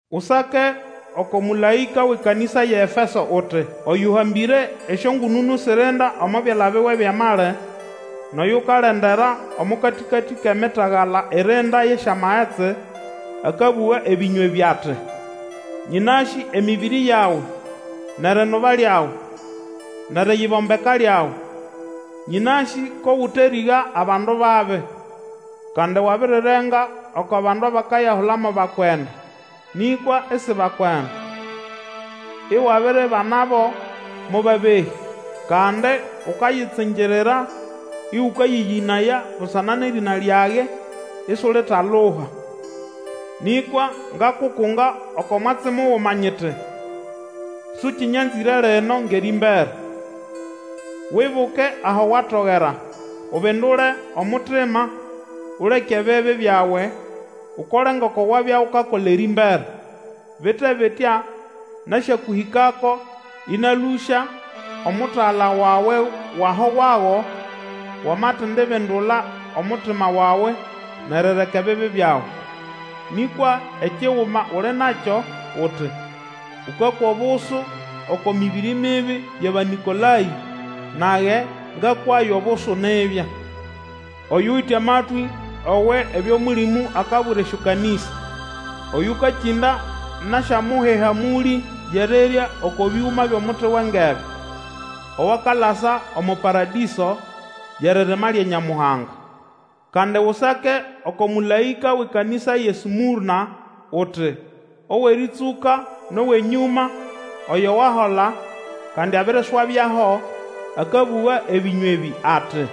Usake oko mũlaĩka wʼekanĩsa yʼeEfeso uti: Oyũhambĩre esyongũnũnũ sirinda omo byala biwe byʼamali, nʼoyukalendera omo katĩkatĩ kʼemitagala irinda yʼesyamagetsi, akabũga ebĩnywa ebĩ ati, Nyĩnasĩ emĩbĩrĩ yawe, nʼerinuba lyawe, nʼeriyibombeka lyawe. Nyĩnasĩ ko gũterĩga abandu babi, kandi wabirirenga oko bandu abakayahula mo bakwenda, nĩkwa isi bakwenda, iwabiribanabo mo babehĩ. Kandi ukayitsingirira ĩgũkayĩyĩnaya busana nʼerĩna lyage, isulitaluha. Nĩkwa ngakukunga oko mwatsi muguma nyiti, Sũkĩnyanzĩre lino ngʼerĩmbere. Wibuke aho watogera! Ubindule omutima, uleke ebibi byawe, Ukole ngoko wabya ukakola erĩmbere. Bite bitya, nasyakũhĩkako, ĩnalũsya omutagala wawe wʼaho wago, wamatindabindula omutima wawe nʼerireka ebibi byawe. Nĩkwa ekiguma uli nakyo uti, ũkakwa obusu oko mĩbĩrĩ mibi yʼAbanĩkolayĩ, nage ngakwayo obusu nibya. Oyuwite amatwĩ owe ebyo Mũlĩmũ akabwira esyokanĩsa! Oyũkakĩnda, nasyamuha ehamũlĩ yʼerirya oko bĩgũma byʼomuti wʼengebe, owakalasa omo Paradĩso, yʼeririma lya Nyamuhanga. Kandi Usake oko mũlaĩka wʼekanĩsa yʼeSmũrna uti, Owʼerĩtsũka nʼowʼenyũma, oyo wahola, kandi abiriswabyaho, akabũga ebĩnywa ebĩ ati,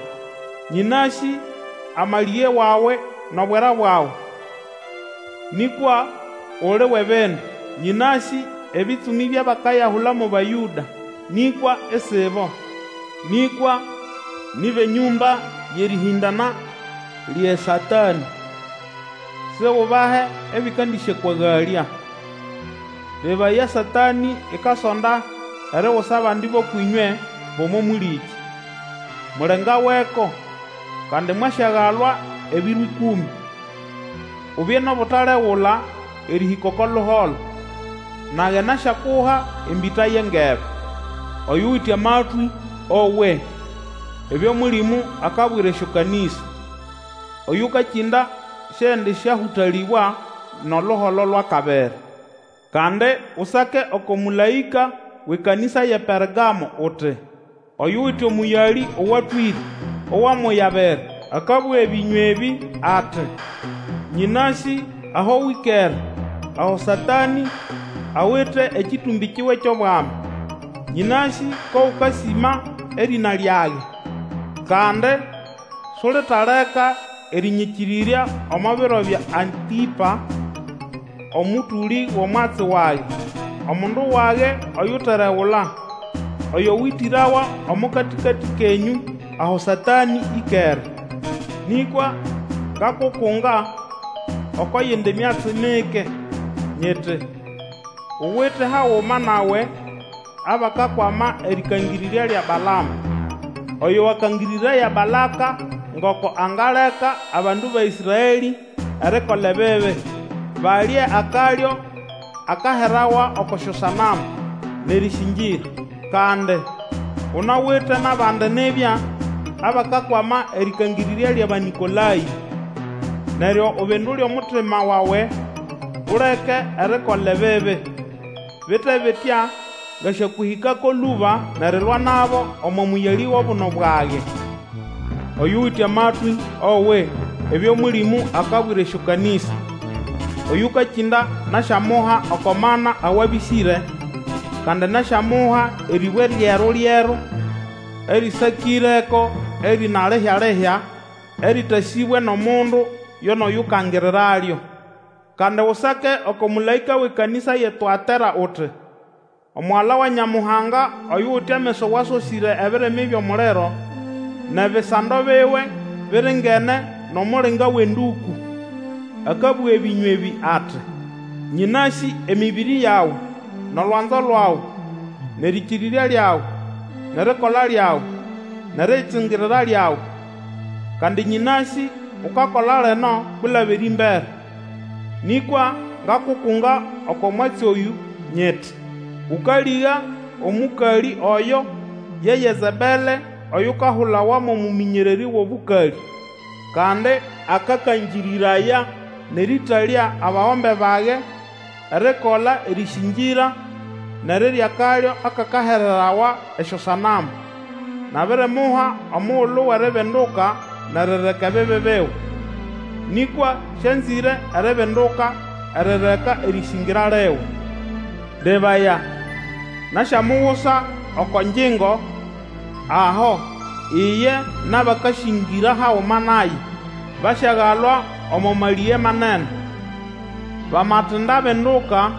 Nyĩnasĩ amalĩge wawe nʼobwera bwawe, nĩkwa uli wʼebindu. Nyĩnasĩ ebĩtsũmĩ byʼabakayahula mo Bayũda, nĩkwa isibo, nĩkwa ni bʼenyũmba yʼerĩhĩndana lyʼeSatanĩ. Sigubahe ebĩkandĩsyakwagalya. Lebaya! Satanĩ ikasonda erigusa abandi bʼũkwʼĩnywe bʼomo mũlĩkĩ, mulengaweko, kandi mwasyagalwa ebiro ĩkũmĩ. Ubye nʼobutalegula erĩhĩka oko luholo, nage nasyakuha embĩta yʼengebe. Oyuwite amatwĩ owe ebyo Mũlĩmũ akabwira esyokanĩsa! Oyũkakĩnda siendĩsyahũtalĩbwa nʼoluholo lwʼakabiri. Kandi Usake oko mũlaĩka wʼekanĩsa yʼePergamo uti, Oyuwite omũyalĩ owatwĩre, owʼamoya abiri, akabũga ebĩnywa ebĩ ati, Nyĩnasĩ aho wĩkere aho Satanĩ awite ekĩtũmbĩ kiwe kyʼobwami. Nyĩnasĩ ko gũkasĩma erĩna lyage, kandi sulitaleka erĩnyĩkĩrĩrya omo biro bya Antĩpa omũtũlĩ wʼomwatsi wage, omundu wage oyuteregula, oyo wĩtĩrawa omo katĩkatĩ kenyũ aho Satanĩ ĩkere. Nĩkwa ngakukunga oko yindi myatsi mike, nyiti, uwite haguma nawe abakakwama erĩkangĩrĩrya lya Balama, oyo wakangĩrĩraya Balaka ngoko angaleka abandu ba Ĩsraelĩ erikola ebibi, balye akalyo akaherawa oko syosanamu, nʼerĩsĩngĩra. Kandi, Unawite nʼabandi nibya abakakwama erĩkangĩrĩrya lyʼAbanĩkolayĩ. Neryo ubindule omutima wawe uleke erikola ebibi! Bite bitya ngasyakũhĩkako lũba nʼerilwa nabo omo mũyalĩ wʼobuno bwage. Oyuwite amatwĩ, owe ebyo Mũlĩmũ akabwira esyokanĩsa! Oyũkakĩnda, nasyamuha oko mana awabĩsĩre. Kandi nasyamuha erĩbwe lyeru-lyeru, erĩsakĩreko erĩna lihya-lihya, erĩtasĩbwe nʼomundu yo nʼoyukangiriralyo. Kandi Usake oko mũlaĩka wʼekanĩsa yʼeTũatera uti, Omugala wa Nyamuhanga, oyuwite ameso awasosĩre ebirimi byʼomuliro, nʼebisando biwe biringene nʼomulinga wʼenduku, akabũga ebĩnywa ebĩ ati, Nyĩnasĩ emĩbĩrĩ yawe, nʼolwanzo lwawe, nʼerĩkĩrĩrya lyawe, nʼerikola lyawe, nʼeriyitsingirira lyawe. Kandi nyĩnasĩ ukakola lino kwilaba erĩmbere. Nĩkwa ngakukunga oko mwatsi oyũ nyiti, Ũkalĩga omũkalĩ oyo ye Yezebele oyukayahula mo mũmĩnyererĩ wʼobũkalĩ, kandi akakangĩrĩraya nʼerĩtalya abagombe bage erikola erĩsĩngĩra nʼerirya akalyo akakahererawa esyosanamu. Nabirimuha omugulu wʼeribinduka nʼerireka ebibi biwe, nĩkwa sĩanzĩre eribinduka erireka erĩsĩngĩra liwe. Lebaya! Nasyamugusa oko ngyingo aho, iye nʼabakasĩngĩra haguma naye basyagalwa omo malĩge manene, bamatindabinduka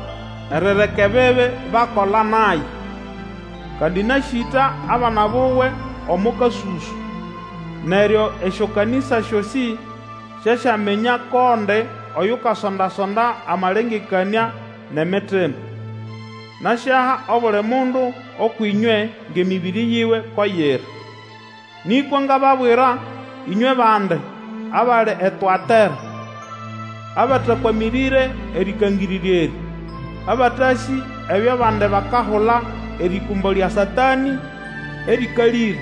erireka ebibi bakola naye. Kandi nasyĩta abana buwe omo kasũsũ. Neryo esyokanĩsa syosĩ syasyaminya ko ndi oyukasonda-sonda amalengekanĩa nʼemitima. Nasyaha obuli mundu ũkwʼĩnywe ngʼemĩbĩrĩ yiwe ko yiri. Nĩkwa ngababwira, ĩnywe bandi, abali eTũatera, abatakwamĩrĩre erĩkangĩrĩrya erĩ, abatasĩ ebyo abandi bakahula erĩkũmbo lya Satanĩ erĩkalĩre,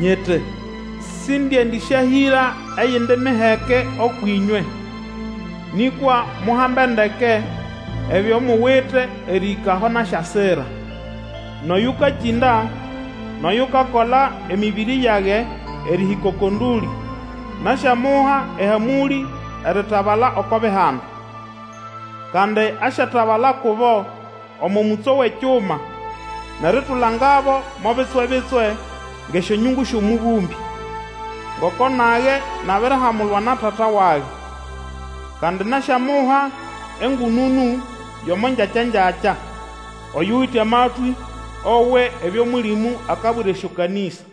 nyiti sindiendĩsyahĩra eyindi miheke ũkwʼĩnywe. Nĩkwa muhambe ndeke ebyo muwite erĩhĩka aho nasyasira. Nʼoyũkakĩnda nʼoyukakola emĩbĩrĩ yage erĩhĩka oko ndũlĩ, nasyamuha ehamũlĩ eritabala oko Bihanda. Kandi asyatabala kubo omo mũtso wʼekyuma, nʼeritulangabo mo bitswe-bitswe ngʼesyonyungu syʼomũbũmbĩ, ngoko nage nabirihamulwa na Tata wage. Kandi nasyamuha engũnũnũ yʼomo ngyakya-ngyakya. Oyuwite amatwĩ, owe ebyo Mũlĩmũ akabwira esyokanĩsa!